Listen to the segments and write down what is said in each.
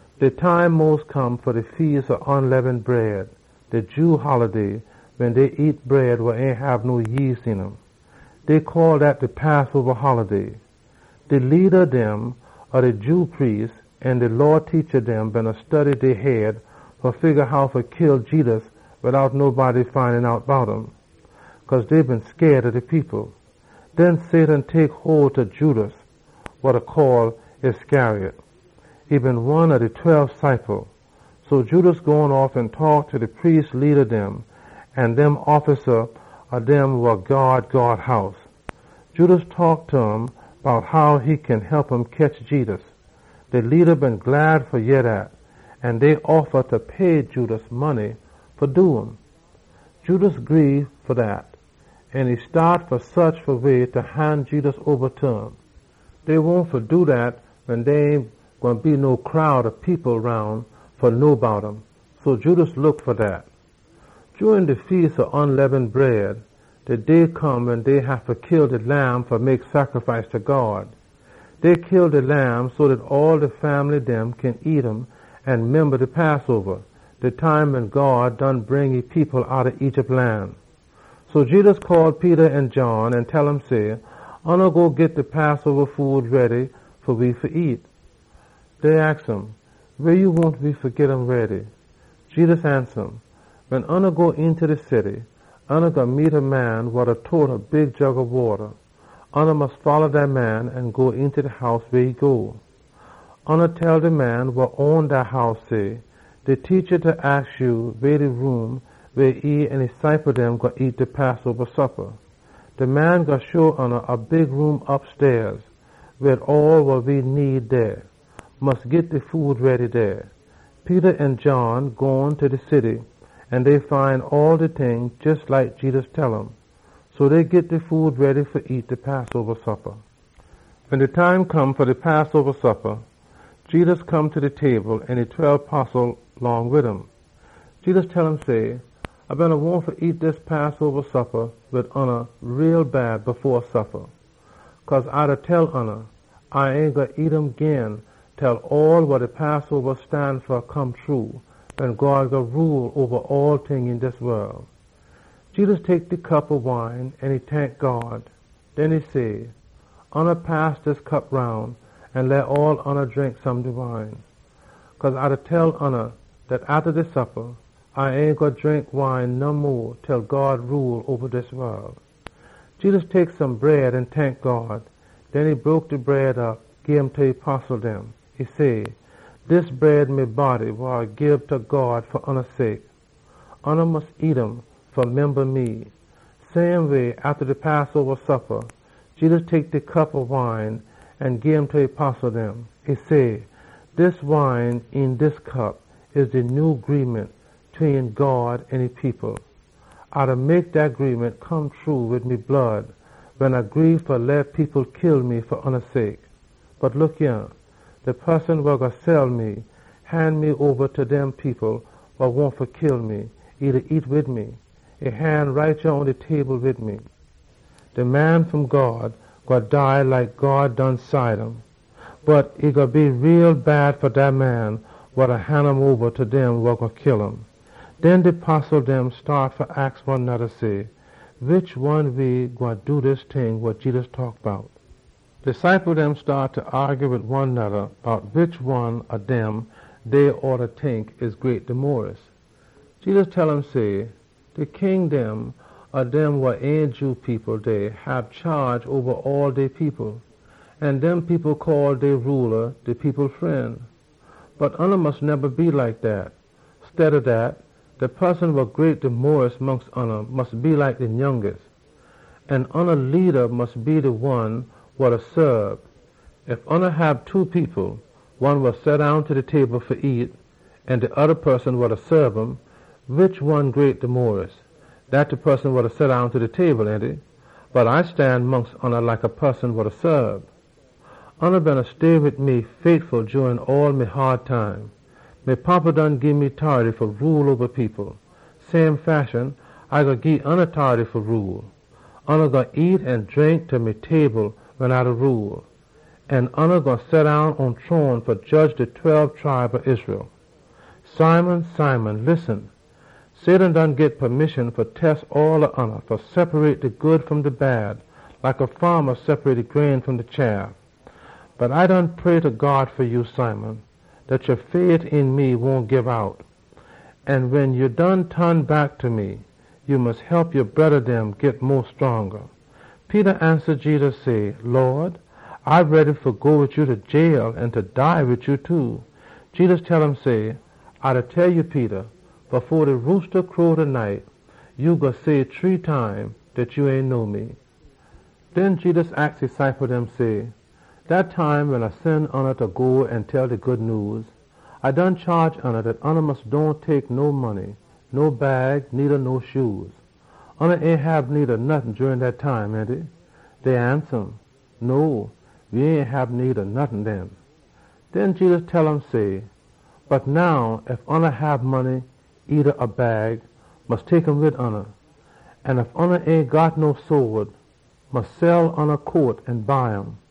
De time mos come fa de Feas ob Unleaven Bread, de Jew holiday wen dey nyam bread wa ain hab no yeast een um. Dey call dat de Passoba holiday. De leada dem ob de Jew priest dem an de Law teacha dem beena study dey head fa figga how fa kill Jedus dout nobody find out bout um. Cause dey been scaid ob de people. Den Satan tek hole ta Judas wa dey call Iscariot. E been one ob de tweb ciple dem. So Judas gone off an taak ta de priest leada dem an dem offisa ob dem wa gyaad God House. Judas taak ta um bout how e kin hep um ketch Jedus. De leada dem been glad fa yeh dat, an dey offa fa pay Judas money fa do um. Judas gree ta dat, an e staat fa saach fa way fa han Jedus oba ta um. Dey been wahn fa do dat wen dey ain gwine be no crowd ob people roun fa know bout um. So Judas look fa dat. Jurin de Feas ob Unleaven Bread, de day come wen dey haffa kill de lamb fa mek sacrifice ta God, so dey kin nyam um an memba de Passoba wen God done bring e people outta Egypt lan. So Jedus call Peter an John an tell um say, “Oona go git de Passoba food ready fa we fa nyam.” Dey aks um, “Weh ya wahn we fa git um ready?” Jedus ansa um, “Wen oona go eenta de city, oona gwine meet a man wa da tote a big jug ob wata. Oona mus folla dat man an go eenta de house weh e go. Tell de man wa own dat house say, ‘De Teacha da aks ya weh de room weh e an e ciple dem gwine nyam de Passoba suppa.’ De man gwine show oona a big room opstair, wid all wa we need dey. Mus git de food ready dey.” Peter an John gone ta de city, an dey find ebryting jes like Jedus tell um. So dey git de food ready fa nyam de Passoba suppa. Wen de time come fa de Passoba suppa, Jedus come ta de table wid e tweb postle dem. Jedus tell um say, “A been wahn fa nyam dis Passoba suppa wid oona too bad fo A suffa. Cause A da tell oona, A ain gwine nyam um gin til all wa de Passoba stan fa come true, wen God gwine rule oba all ting een dis wol.” Jedus tek de cup ob wine an e tank God. Den e say, “Oona pass dis cup roun an leh all oona drink. Cause A da tell oona dat atta dis suppa, A ain gwine drink wine no mo til God rule oba dis wol.” Jedus tek some bread an e tank God. Den e broke op de bread, gim ta e postle dem. E say, “Dis bread me body wa A da gii ta God fa oona sake. Oona mus nyam um fa memba me.” Same way, atta de Passoba suppa, Jedus tek de cup ob wine an gim ta e postle dem. E say, “De wine een dis cup, e de nyew cobnant tween God an e people. A da seal dat cobnant wid me blood, wen A gree fa leh people kill me fa oona sake. “Bot look yah! De poson wa gwine han me oba ta dem people wa wahn fa kill me, e da nyam wid me! E han right yah pon de table wid me! De Man wa Come fom God gwine dead like God done cide um. Bot e gwine be too bad fa dat man wa da han um oba ta dem wa gwine kill um!” Den de postle dem staat fa aks one noda say, “Wish one ob we gwine do dis ting wa Jedus taak bout?” De ciple dem staat fa aagy wid one noda bout wish one ob dem dey oughta tink e great mo den all. Jedus tell um say, “Dey een de wol, de king dem hab chaage oba dey people. An dem people call dey rula ‘De People Fren.’ Bot oona mus dohn neba be like dat. Steada dat, de poson wa greata mongst oona mus be like de nyounga. An oona leada mus be like de one wa da saab. Ef oona hab two people, one wa seddown ta de table fa nyam an de oda poson wa da saab um, wish one de greata? Dat de poson wa da seddown ta de table, ainty? Bot A da stan mongst oona like a poson wa da saab. “Oona beena stay wid me jurin all me haad time. Me Fada done gii me tority fa rule oba people. Same fashion, A gwine gii oona tority fa rule. Oona gwine nyam an drink ta me table wen A da rule. An oona gwine seddown pon shrone fa jedge de tweb tribe ob Israel. “Simon, Simon, listen! Satan done aks fa test all ob oona fa wide op de good fom de bad, like a faama da wide op e grain fom de chaff. Bot A done pray ta God fa ya, Simon, dat ya ain gwine loss ya fait een me. An wen ya done ton back ta me, ya mus hep ya broda dem git mo scronga.” Peter ansa Jedus say, “Lawd, A ready fa go wid ya ta de jailhouse, an fa dead wid ya too!” Jedus tell um say, “A da tell ya, Peter, fo de roosta crow taday, ya gwine say shree time dat ya ain know me.” Den Jedus aks e ciple dem say, “Dat time wen A been sen oona fa go an tell de Good Nyews, A been chaage oona dat oona mus dohn tek no money, no bag needa no shoe. Oona ain hab need ob nottin jurin dat time, ainty?” Dey ansa um, “No, we ain been need nottin den.” Den Jedus tell um say. “Bot now, ef oona hab money or a bag, mus tek um wid oona. An ef oona ain got no sode, mus sell oona coat an buy um.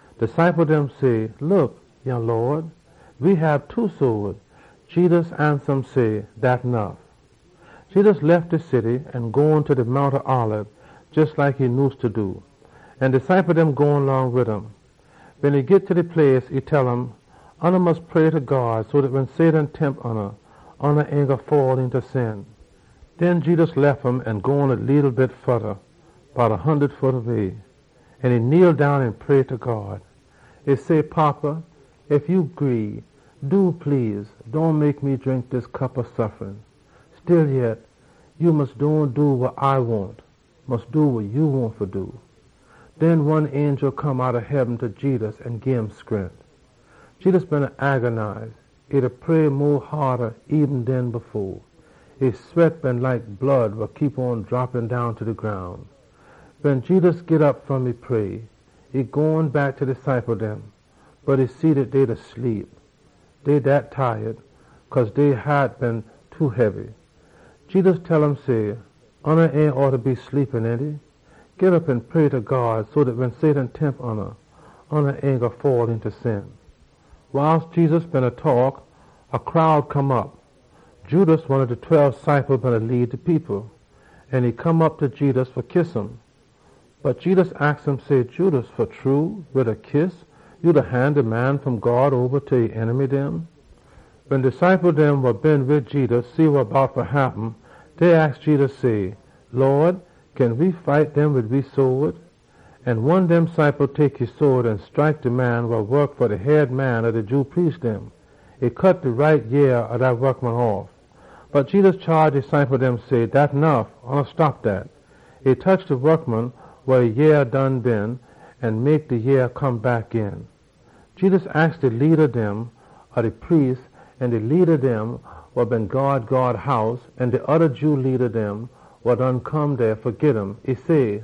De ciple dem say, “Look yah, Lawd! We hab two sode.” Jedus ansa um say, “Dat nuff!” Jedus lef de city an gone ta de Mount Olib, jes like e nyuse fa do, an de ciple dem gone long wid um. Wen e git ta de place, e tell um, “Oona mus pray ta God so dat wen Satan tempt oona, oona ain gwine fall eenta sin.” Den Jedus lef um an gone a leetle bit mo, bout one hundud foot way. An e kneel down an pray ta God. E say, “Fada, ef ya gree, do please, tek way dis cup wa A fa suffa. Stillyet, ya mus dohn do wa A wahn. Mus do wa ya wahn fa do.” Den one angel come outta heaben ta Jedus an gim scrent. Jedus beena suffa tommuch, an e pray eben mo haada. E sweat been like blood wa da drop down ta de groun. Wen Jedus git op fom e pray, e gone back ta de ciple dem. Bot e see dat dey beena sleep, cause dey haat been too hebby. Jedus tell um say, “Oona ain oughta sleep, ainty? Git op an pray ta God so dat wen Satan tempt oona, oona ain gwine fall eenta sin.” Wiles Jedus beena taak, a crowd come op. Judas, one ob de tweb ciple dem, beena lead de people. An e come op ta Jedus fa kiss um. Bot Jedus aks um say, “Judas, wid a kiss ya da han de Man wa Come fom God oba ta e enemy dem?” Wen de ciple dem wa been wid Jedus see wa bout fa happen, dey aks Jedus say, “Lawd, kin we fight dem wid we sode?” An one dem ciple tek e sode an scrike de saabant ob de head man ob de Jew priest dem an cut off e right yea. Bot Jedus chaage e ciple dem say, “Dat nuff. Oona stop dat!” E tetch de saabant head an heal e yea. Jedus aks de leada dem ob de priest dem an de leada dem wa beena gyaad God House an de oda Jew leada dem wa been come dey fa git um, e say,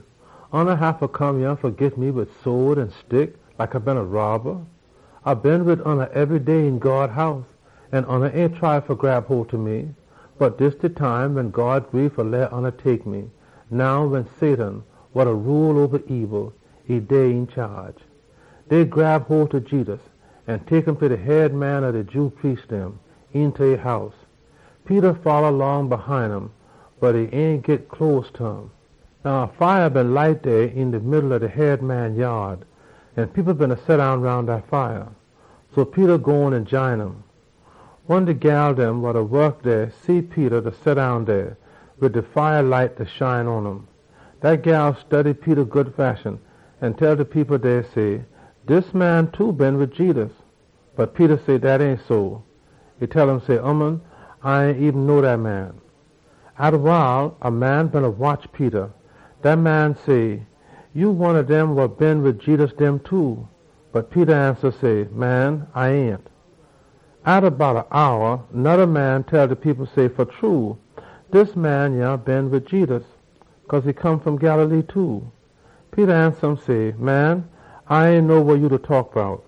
“Oona haffa come yah fa git me wid sode an stick like A been a robba? A been wid oona ebry day een God House, an oona ain try fa grab hole ta me. Bot dis de time wen God gree fa leh oona tek me, now wen Satan wa da rule oba de daakness dey een chaage.” Dey grab hole ta Jedus an tek um ta de head man ob de Jew priest dem, eenta e house. Peter folla long hine um bot e ain git close ta um. Now a fire been light dey een de middle ob de head man yaad, an people beena seddown roun dat fire. So Peter gone an jine um. One saabant gyal see Peter da seddown dey, wid de fire light da shine pon um. Dat gyal study Peter good fashion an e tell de people dey, say, “Dis man too been wid Jedus!” Bot Peter say dat ain so. E tell um say, “Ooman, A ain eben know dat man!” Atta wile, a man beena watch Peter. Dat man say, “Ya one ob dem wa been wid Jedus dem too!” Bot Peter ansa say, “Man, A ain!” Atta bout one hour, noda man tell de people say, “Fa true, dis man yah been wid Jedus, cause e come fom Galilee too.” Peter ansa um say, “Man, A ain know wa ya da taak bout!”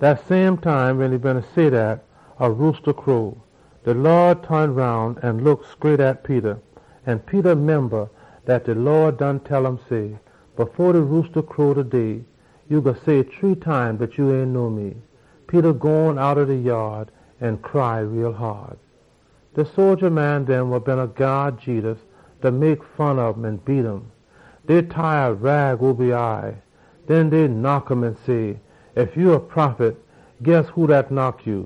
Dat same time wen e beena say dat, a roosta crow. De Lawd ton roun an look scraight at Peter. An Peter memba dat de Lawd done tell um say, “Fo de roosta crow taday, ya gwine say shree time dat ya ain know me.” Peter gone outta de yaad an e cry bitta teah. De sodja dem wa beena gyaad Jedus mek fun ob um an beat um. Dey tie a rag oba e eye, den dey knock um an say, “Ef ya a prophet, tell we who dat knock ya!”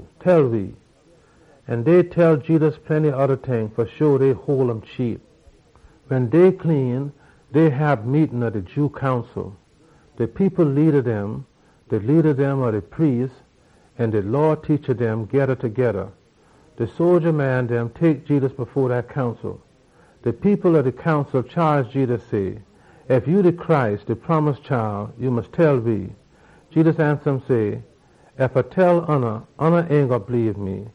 An dey tell Jedus plenty oda ting fa hole um cheap. Wen day clean, dey hab meetin ob de Jew Council. De people leada dem, de leada dem ob de priest dem, an de Law teacha dem geda togeda, an de sodja dem tek Jedus fo dat Council. De people ob de Council chaage Jedus say, “Ef ya de Messiah, ya mus tell we.” Jedus ansa um say, “Ef A tell oona, oona ain gwine bleebe me.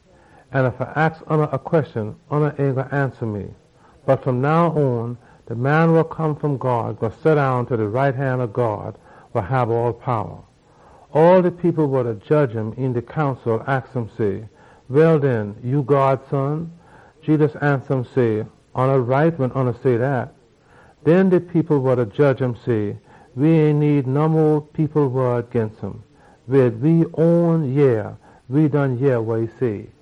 An ef A aks oona a queshon, oona ain gwine ansa me. Bot fom now on, de Man wa Come fom God gwine seddown ta de right han ob God, wa hab all powa.” All de people wa beena jedge um een de Council aks um say, “Well den, ya God Son?” Jedus ansa um say, “Oona right wen oona say dat.” Den de people wa beena jedge um say, “We ain need no mo people wod ginst um. Wid we own yea we done yeh wa e say!”